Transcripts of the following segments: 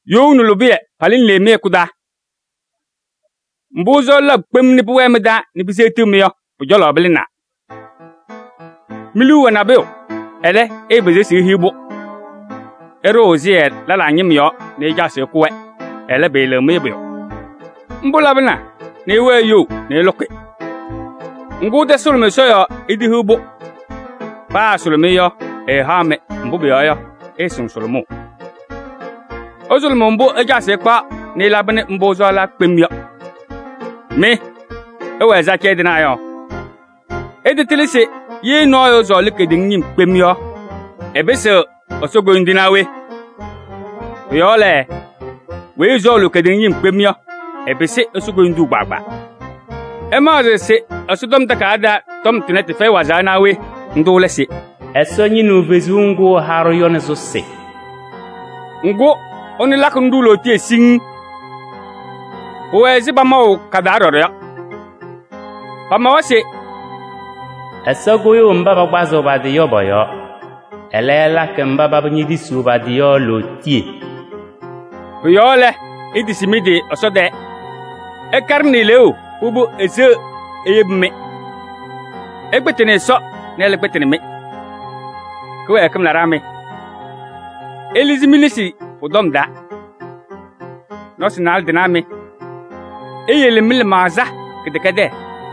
You nɛ lʋbɩyɛ palɩnɩ le mɩ-hɛkʋ taa? Mbʋ́ ɩsɔɔlɩ labʋ kpem nɛ pʋwɛɛ mɩ-taa nɛ piseɣtiɣ-mɩ yɔ, pʋ-cɔlɔ pɩlɩnaa. Mi-liu wɛ nabʋyʋ, ɛlɛ́, ɩɩpɩzɩɣ se ihiɣ-pʋ. Ɩɖʋʋ ɛsɩyɛ lɛlaa ñɩm yɔɔ nɛ ɩcaɣ se ɩkʋ-wɛ, ɛlɛ́, pɩɩlɩɣ-mɩ pʋyʋ. Ḿbʋ́ labɩna nɛ ɩwɛɛ iyou nɛ ɩlʋkɩ. Ŋgʋ́, ɩtasʋlʋmɩ Ɛsɔ yɔɔ itehiɣ-pʋ. Paa ɩsʋlʋmɩ-ɩ yɔ, ɛɛhaɣ-mɩ, mbʋ́ pʋyɔɔ yɔ, ɩɩsɩŋ sʋlʋmʋʋ: ɩsʋlʋmʋʋ mbʋ́ ɩcaɣ se ɩkpaɣ nɛ ɩlabɩnɩ mbʋ́ ɩsɔɔlaa kpem yɔ. Mɩ, ɩwɛ ɛzɩ acɛyɛ tɩnaa yɔ! Ɩtatɩlɩ se yee nɔɔyʋ ɛsɔɔlɩ kedeŋa ñɩm kpem yɔ, ɛpɩsɩɣ Ɛsɔ koyindu naa we? Pʋ-yɔɔ lɛ, weyi ɛsɔɔlʋʋ kedeŋa ñɩm yɔ, ɛpɩsɩɣ Ɛsɔ koyindu kpaagbaa. Ɩmaɣzɩɣ se Ɛsɔtɔm Takayaɣ taa tɔm tʋnɛ, tɩfɛyɩ wazaɣ naa we? Ńdʋ́ lɛ se: “Ɛsɔ ñɩnɩɣ fezuu ŋgʋ́ ɛha-ɖʋ yɔ nɛ sʋsɩ.” Ŋgʋ́, ɛnʋ lakɩnɩ-ɖʋ lootiye siŋŋ. Pʋwɛ ɛzɩ pamaʋ ka-taa ɖɔɖɔ yɔ. Pamawa se: “Ɛsɔ kʋyʋʋ mbá pakpazɩɣ pa-tɩ yɔ pɔ-yɔɔ. Ɛlɛ́, ɛlakɩ mbá paba ñetisiɣ pa-tɩ yɔ lootiye.” Pʋ-yɔɔ lɛ, itisi mɩ-tɩ Ɛsɔ tɛɛ. Ɩkaɖɩnɩ eleeu, pʋbʋ, eseɣ eyebi-mɩ. Ɩkpɩtɩnɩ Ɛsɔ nɛ ɛ́lɛ́ kpɩtɩnɩ-mɩ. Kɩwɛɛkɩm laɖaa mɩ! Ɩlɩzɩ mi-nesi pʋ-tɔm taa. Nɔsɩ naalɛ tɩnaa mɩ! Iyele mɩ-lɩmaɣza kɩdɛkɛdɛɛ.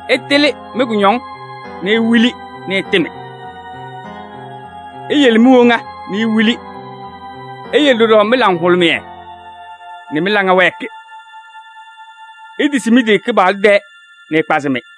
Ɩtɩlɩ mɩ-kʋñɔŋ nɛ iwili nɛ ɩtɩmɩ. Iyele mi-woŋa nɛ iwili, iyele ɖɔɖɔ mɩ-laŋhʋlʋmɩyɛ nɛ mɩ-laŋa wɛɛkɩ. Itisi mɩ-tɩ Kɩpaɣlʋ tɛɛ nɛ ɛkpazɩ-mɩ.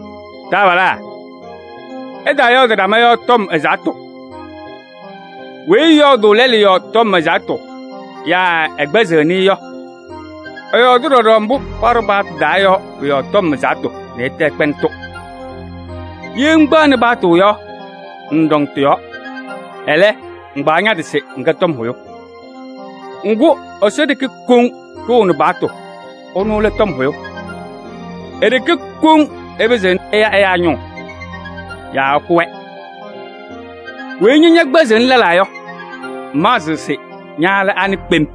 Taabalaa! Ɩtaayɔɔdɩ ɖama yɔɔ tɔm ɛzaɣ́tʋ. Weyi ɛyɔɔdʋʋ lɛlʋ yɔɔ tɔm ɛzaɣ́tʋ yaa ɛkpɛzɩɣnɩ-ɩ yɔ, ɛyɔɔdɩ ɖɔɖɔ mbʋ́ paɖʋ paɣtʋ taa yɔ pʋ-yɔɔ tɔm ɛzaɣ́tʋ nɛ ɛtɛ ɛkpɛɛnɩ-tʋ. Yee ŋkpɛɣnɩ paɣtʋ yɔ, ŋŋɖɔŋ tɩ-yɔɔ, ɛlɛ́, ŋkpaɣ ña-tɩ se ŋkɛ tɔm hʋyʋ. Ŋgʋ́, Ɛsɔ ɖeke koŋ ɖʋʋnɩ paɣtʋ, ɛnʋ lɛ tɔm hʋyʋ. E-ɖeke koŋ ɛpɩzɩɣnɩ ɛya ɛyáa ñʋʋ yaa ɛkʋ-wɛ. Weyi ña ñɛkpɛzɩɣnɩ lɛlaa yɔ, ŋmaɣzɩɣ se ña lɛ anɩ kpem?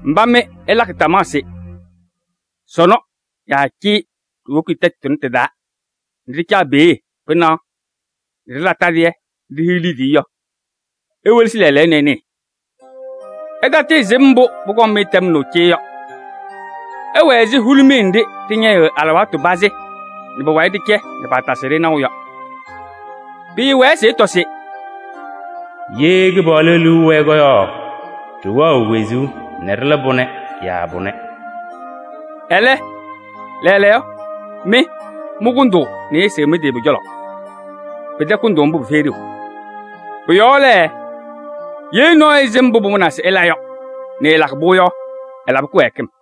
Mbá mɩ ɩlakɩ tamaɣ se: “Sɔnɔ yaa cee ɖiwoki tɛtʋ tʋnɛ tɩ-taa nɛ ɖɩcaɣ peeɖe pɩnaɣ nɛ ɖɩla tadɩyɛ nɛ ɖihiɣ liidiye” yɔ, iwelesi lɛɛlɛɛyɔ nɛ ɩnɩɩ. Ɩtatɩɩsɩm mbʋ́ pʋkɔŋ-mɩ tɛmnaʋ cee yɔ! Ɩwɛ ɛzɩ hulumiye nɖɩ́ ɖɩñɛyɩɣ alɩwaatʋ pazɩ nɛ pʋwayɩ ɖɩcɛ nɛ paatasɩɣ-ɖɩ naʋ yɔ. Pɩɩwɛɛ se ɩtɔ se: “Yee Kɩpaɣlʋ liu ɛwɛɛ yɔ, ɖɩwɛɣ wezuu nɛ ɖɩla pʋnɛ yaa pʋnɛ.” Ɛlɛ́, lɛɛlɛɛyɔ, mɩ mɩkʋndʋʋ nɛ ɩɩsɩɣ mɩ-tɩ pʋ-cɔlɔ. Pɩtɛ kʋndʋʋ ḿbʋ́, pɩfɛyɩ ɖeu. Pʋ-yɔɔ lɛ, yee nɔɔyʋ ɛsɩm mbʋ́ pʋmʋnaa se ɛla yɔ nɛ ɛɛlakɩ-pʋ yɔ, ɛlabɩ kɩwɛɛkɩm.